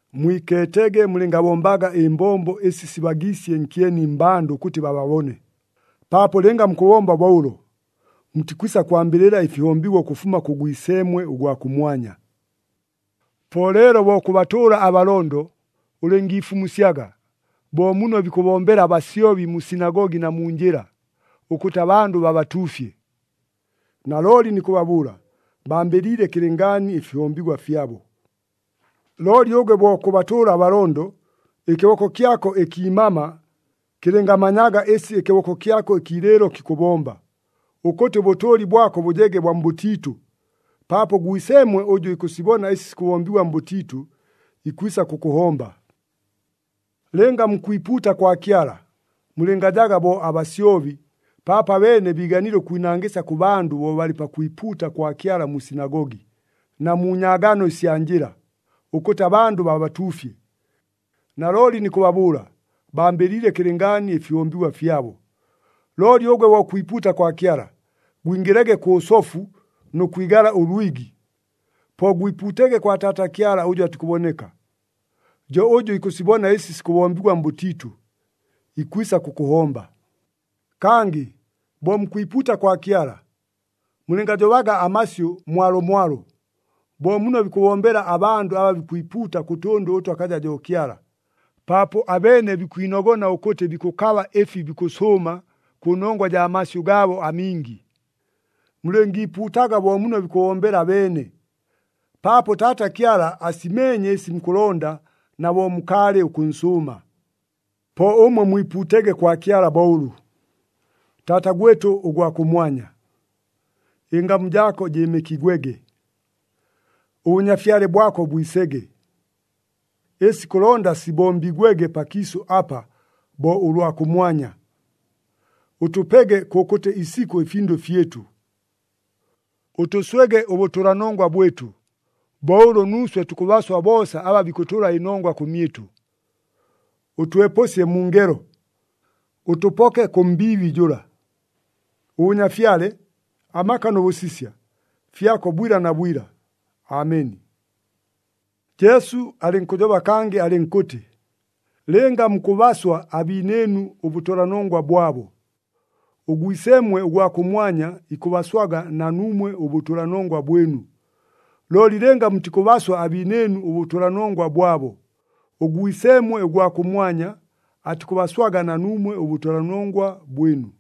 “Mwikeetege mulɨngabombaga ɨmbombo ɨsi sibagiisye nkyeni mmbandʉ ʉkʉtɨ bababone, paapo lɨnga mukʉbomba bo ʉlo, mutikwisa kwambɨlɨla ɨfihombigwa ʉkʉfuma kʉ Gwiseemwe ʉgwa kʉmwanya. “Po leelo bo kʉbatʉʉla abalondo, ulɨngiifumusyaga, bo muno bikʉbombela abasyobi mu sinagogi na mu njɨla, ʉkʉtɨ abandʉ babatuufye. Nalooli nikʉbabʉʉla, bambɨliile kɨlɨngaani ɨfihombigwa fyabo. Looli ʉgwe bo kʉbatʉʉla abalondo, ɨkɨboko kyako ɨkiimama kɨlɨngamanyaga ɨsi ɨkɨboko kyako ɨkiilɨɨlo kikʉbomba, ʉkʉtɨ ʉbʉtʉʉli bwako bʉjege bwa mbʉtiitʉ, paapo ʉGwiseemwe ʉjʉ ikʉsibona ɨsi sikʉbombigwa mbʉtiitʉ, ikwisa kʉkʉhomba. “Lɨnga mukwipuuta kwa Kyala, mulɨngajaga bo abasyobi, paapo abeene biiganile ʉkwinangɨsya kʉ bandʉ bo balɨ pakwipuuta kwa Kyala mu sinagogi, na mu nyaagano ɨsya njɨla, ʉkʉtɨ abandʉ babatuufye. Nalooli nikʉbabʉʉla, bambɨliile kɨlɨngaani ɨfihombigwa fyabo. Looli ʉgwe bo kwipuuta kwa Kyala, gwingɨlege kʉ sofu nʉ kwigala ʉlwigi, po gwipuutege kwa Taata Kyala ʉjʉ atikʉboneka. Jo ʉjʉ ikʉsibona ɨsi sikʉbombigwa mbʉtiitʉ, ikwisa kʉkʉhomba. “Kangɨ bo mukwipuuta kwa Kyala, mulɨngajobaga amasyʉ mwalomwalo, bo muno bikʉbombela abandʉ aba bikwipuuta kʉ tʉndʉ ʉtʉ akaja jo Kyala, paapo abeene bikwinogona ʉkʉtɨ bikʉkaba ɨfi bikʉsʉʉma kʉnongwa jaa masyʉ gaabo amingi. Mulɨngiipuutaga bo muno bikʉbombela abeene, paapo Taata Kyala asimeenye ɨsi mukʉlonda na bo mukaalɨ ʉkʉnsʉʉma. “Po ʉmwe mwipuutege kwa Kyala bo ʉlʉ, ‘Taata gwɨtʉ ʉgwa kʉmwanya, ɨngamu jaako jɨɨmɨkigwege. ɄBʉnyafyale bwako bwisege. Ɨsi kʉlonda sibombigwege pakiisʉ apa, bo ʉlwa kʉmwanya. Ʉtʉpege kʉkʉtɨ isikʉ ɨfindʉ fyɨtʉ. Ʉtʉswege ʉbʉtʉlanongwa bwɨtʉ, bo ʉlʉ nuuswe tukʉbaswa boosa aba bikʉtʉla ɨnongwa kʉmyɨtʉ. Ʉtwepʉsye mu ngelo, ʉtʉpoke kʉ mbiibi jʉla. [ɄBʉnyafyale, amaka nʉ bʉsisya, fyako bwila na bwila! Ameni.]’” Jesu alɨnkʉjoba kangɨ, alɨnkʉtɨ, “Lɨnga mukʉbaswa abiinɨɨnu ʉbʉtʉlanongwa bwabo, ʉGwiseemwe ʉgwa kʉmwanya ikʉbaswaga na nuumwe ʉbʉtʉlanongwa bwɨnu. Looli lɨnga mutikʉbaswa abiinɨɨnu ʉbʉtʉlanongwa bwabo, ʉGwiseemwe ʉgwa kʉmwanya atikʉbaswaga na nuumwe ʉbʉtʉlanongwa bwɨnu.”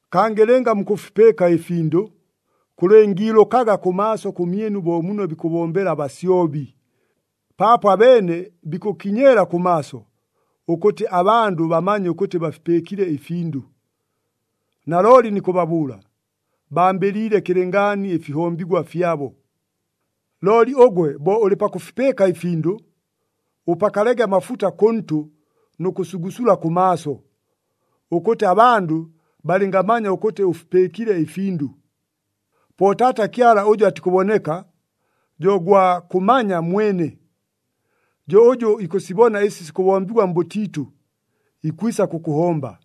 “Kangɨ lɨnga mukʉfipɨɨka ɨfindʉ, kʉlɨngiilʉkaga kʉmaaso kʉmyɨnu bo muno bikʉbombela abasyobi, paapo abeene bikʉkiinyeela kʉmaaso, ʉkʉtɨ abandʉ bamanye ʉkʉtɨ bafipɨɨkile ɨfindʉ. Nalooli nikʉbabʉʉla, bambɨliile kɨlɨngaani ɨfihombigwa fyabo. Looli ʉgwe bo ʉlɨ pakʉfipɨɨka ɨfindʉ, ʉpakalege amafuta kʉntʉ nʉ kʉsugusula kʉmaaso, ʉkʉtɨ abandʉ balɨngamanya ʉkʉtɨ ʉfipɨɨkile ɨfindʉ. Po Taata Kyala ʉjʉ atikʉboneka, jo gwa kʉmanya mwene. Jo ʉjʉ ikʉsibona ɨsi sikʉbombigwa mbʉtiitʉ, ikwisa kʉkʉhomba.”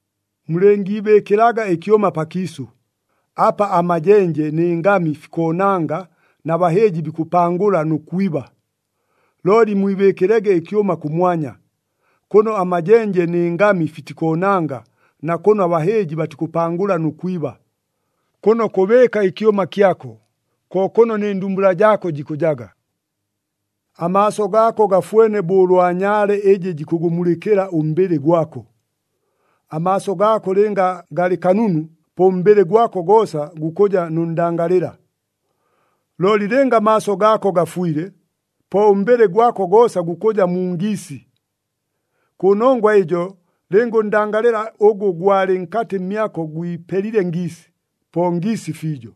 “Mulɨngiibɨɨkɨlaga ɨkyʉma pakiisʉ, apa amajenje nɨ ngami fikoonanga na bahɨɨji bikʉpangʉla nʉ kwiba. Looli mwibɨɨkɨlege ɨkyʉma kʉmwanya, kʉno amajenje nɨ ngami fitikoonanga na kʉno abahɨɨji batikʉpangʉla nʉ kwiba. Kʉno kʉbɨɨka ɨkyʉma kyako, ko kʉno nɨ ndumbula jaako jikʉjaga. “Amaaso gaako gafwene bo ʉlwa nyaale ɨjɨ jikʉgʉmulɨkɨla ʉmbɨlɨ gwako. Amaaso gaako lɨnga galɨ kanunu, po ʉmbɨlɨ gwako goosa gukʉja nʉ ndangalɨla. Looli lɨnga amaaso gaako gafwile, po ʉmbɨlɨ gwako goosa gukʉja mu ngiisi. Kʉnongwa ɨjo lɨnga ʉndangalɨla ʉgʉ gwalɨ nkatɨ mmyako gwipelile ngiisi, po ngiisi fiijo!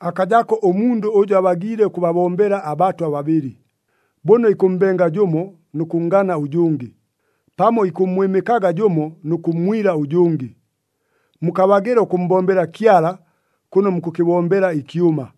“Akajako ʉmundʉ ʉjʉ abagiile ʉkʉbabombela abatwa babɨlɨ. Bʉno ikʉmmbenga jʉmo nʉ kʉnngana ʉjʉngɨ, pamo ikʉmmwɨmɨkaga jʉmo nʉ kʉmmwila ʉjʉngɨ. Mukabagɨla ʉkʉmmbombela Kyala, kʉno mukʉkɨbombela ɨkyʉma!”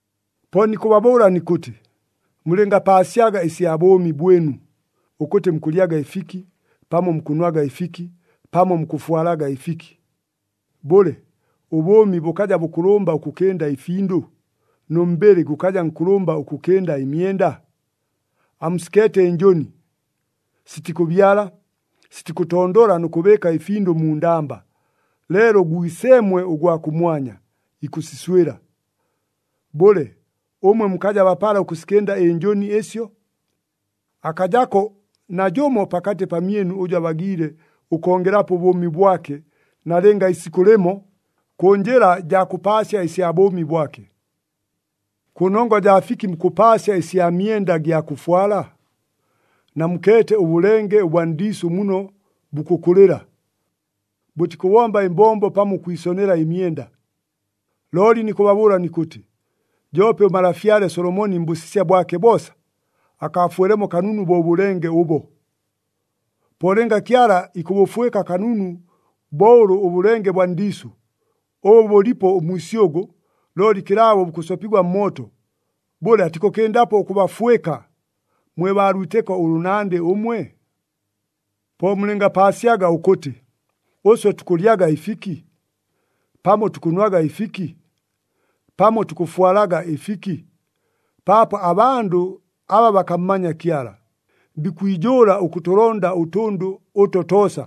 “Po nikʉbabʉʉla nikʉtɨ, mulɨngapaasyaga ɨsya bʉʉmi bwɨnu, ʉkʉtɨ mukʉlyaga ɨfiki, pamo mukʉnwaga ɨfiki, pamo mukʉfwalaga ɨfiki. Bʉle, ʉbʉʉmi bʉkaja bʉkʉlʉmba ʉkʉkɨnda ɨfindʉ, nʉ mbɨlɨ gʉkaja nkʉlʉmba ʉkʉkɨnda ɨmyenda? Amusikeete ɨnjʉni. Sitikʉbyala, sitikʉtondola nʉ kʉbɨɨka ɨfindʉ mu ndamba, leelo ʉGwiseemwe ʉgwa kʉmwanya, ikʉsiswɨla. Bʉle, ʉmwe mukaja bapala ʉkʉsikɨnda ɨnjʉni ɨsyo? Akajako najʉmo pakatɨ pamyɨnu ʉjʉ abagiile ʉkongelapo ʉbʉʉmi bwake nalɨnga isikʉ lɨmo, kʉ njɨla jaa kʉpaasya ɨsya bʉʉmi bwake. “Kʉnongwa jaa fiki mukʉpaasya ɨsya myenda ɨgya kʉfwala? Namukeete ʉbʉlenge ʉbwa ndiisʉ muno bukʉkʉlɨla. Bʉtikʉbomba ɨmbombo pamo ʉkwisonela ɨmyenda. Looli nikʉbabʉʉla nikʉtɨ, joope ʉmalafyale Solomoni mbʉsisya bwake boosa, akaafwelemo kanunu bo ʉbʉlenge ʉbo! Po lɨnga Kyala ikʉbʉfwɨka kanunu bo ʉlʉ ʉbʉlenge bwa ndiisʉ, ʉbʉ bʉlipo ʉmwisyʉgʉ, looli kɨlaabo bukʉsopigwa mmooto, bʉle atikʉkɨndapo ʉkʉbafwɨka, mwe baa lwitɨko ʉlʉnandɨ ʉmwe? “Po mulɨngapaasyaga ʉkʉtɨ, ‘Ʉswe tukʉlyaga ɨfiki? Pamo tukʉnwaga ɨfiki? Pamo tukʉfwalaga ɨfiki?’ Paapo abandʉ aba bakammanya Kyala, bikwijʉʉla ʉkʉtʉlonda ʉtʉndʉ ʉto toosa,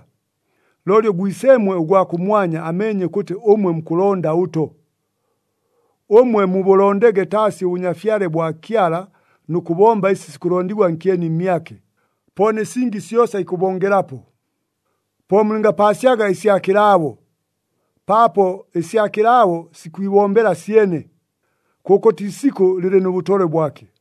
looli ʉGwiseemwe ʉgwa kʉmwanya ameenye ʉkʉtɨ ʉmwe mukʉlonda ʉto! Ʉmwe mubʉlondege taasi ʉBʉnyafyale bwa Kyala nʉ kʉbomba ɨsi sikʉlondigwa nkyeni mmyake, po nɨ singi syosa ikʉbongelapo. “Po mulɨngapaasyaga ɨsya kɨlaabo, paapo ɨsya kɨlaabo sikwibombela syene. Kʉkʉtɨ isikʉ lɨlɨ nʉ bʉtolwe bwake.”